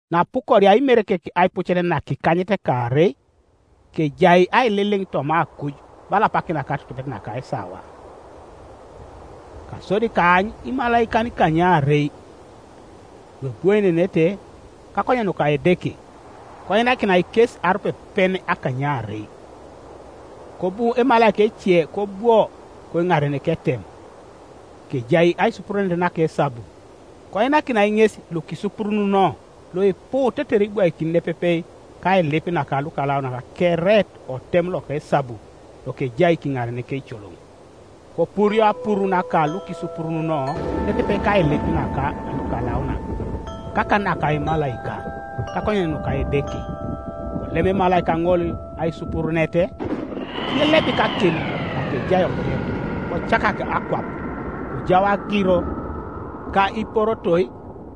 Naapukoria Imerekek aipucet nakikanyetekaarei, kejai aililiŋ toma akuj bala apak naka atutubet naka esawa. Kasodi kaany imalaikan ikanykaarei luebwoenenete kakonyen nuka Edeke, koinakinai kes arupepen akanykaarei. Kobu emalaika ece kobwo koiŋaren ketem, kejai aisupurunet naka esabu; koinakinai ŋes lukisupurununo luipu tetere ibwaikin nepepe kailip naka lukalaunak kere otem loka esabu lokejai kiŋaren keicoloŋ. Kopurio apuru naka lukisupurununo nepepe kailip naka lukalaunak, kakan naka emalaika, kakonyen nuka Edeke. Kolem emalaika ŋol aisupurunet, kilelebik akim nakejai otem, kocakak akwap; kojau agiro, ka iporotoi,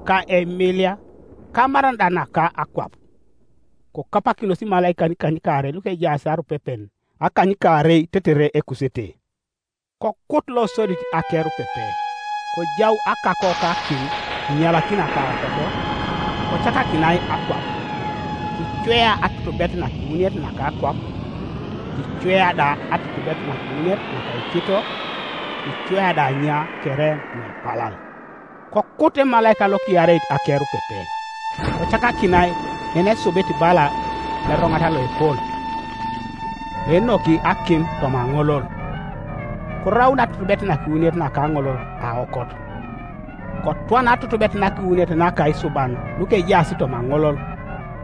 ka eimilia, ka amaran da naka akwap. Kokapakinos imalaikan ikanykaarei lukejaas arupepen akanykaarei tetere ekusete. Kokut losodit akerupepe, kojau akako ka akim inyalakina kaokot, kocakakinai akwap; kicwea atutubet nakiwuniet naka akwap, kicwea da atutubet nakiwuniet naka ikito, kicwea da anya kere nuepalal. Kokut emalaika lokiareit akerupepe, kocakakinai yenesubit bala eroŋat loepol, loenoki akim, toma aŋolol; koraun atutubet nakiwuniet naka aŋolol aokot, kotwana atutubet nakiwuniet naka isuban lukejaas toma aŋolol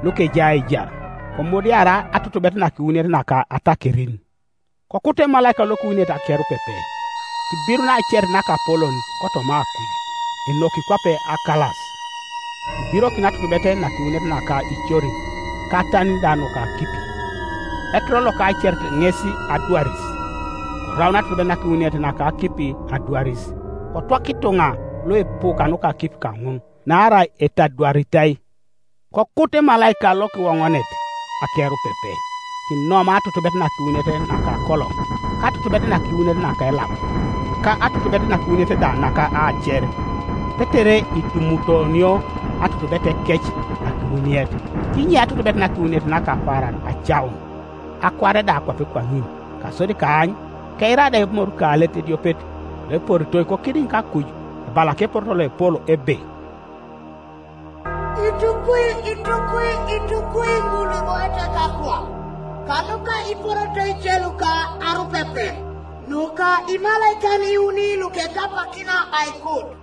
lukejai aijar; komudiarai atutubet nakiwuniet naka atakerin. Kokut emalaika lokiwuniet akerupepe, kibirun aacerit nakapolon kotoma akuj, enoki kwape akalas, kibirokin atutubet nakiwuniet naka icorin, ka atanin da nuka akipi. Ekiror loka aacerit ŋes Adwaris. Koraun atutubet nakiwuniet naka akipi adwaris, kotwaka ituŋa luipu kanuka akipi kaŋun, naarai etadwaritai. Kokut emalaika lokiwoŋonet akerupepe, kinomai atutubet nakiwuniet naka akoloŋ, ka atutubet nakiwuniet naka elap, ka atutubet nakiwuniet da naka aacer, tetere itumutonio atutubetekec nakiwuniet, kinye atutubet nakiwuniet naka apaaran acaun, akuare da kwape kwaŋin. Kasodi kaany, keira da emorukaalet ediopet, loeporitoi kokidiŋ kakuj, ebala keporoto loepol ebe, “Itukwi, itukwi, itukwi ŋul luiboiete kakwap, kanuka iporotoi ice luka arupepen nuka imalaikan iuni lukekapakina aikut!”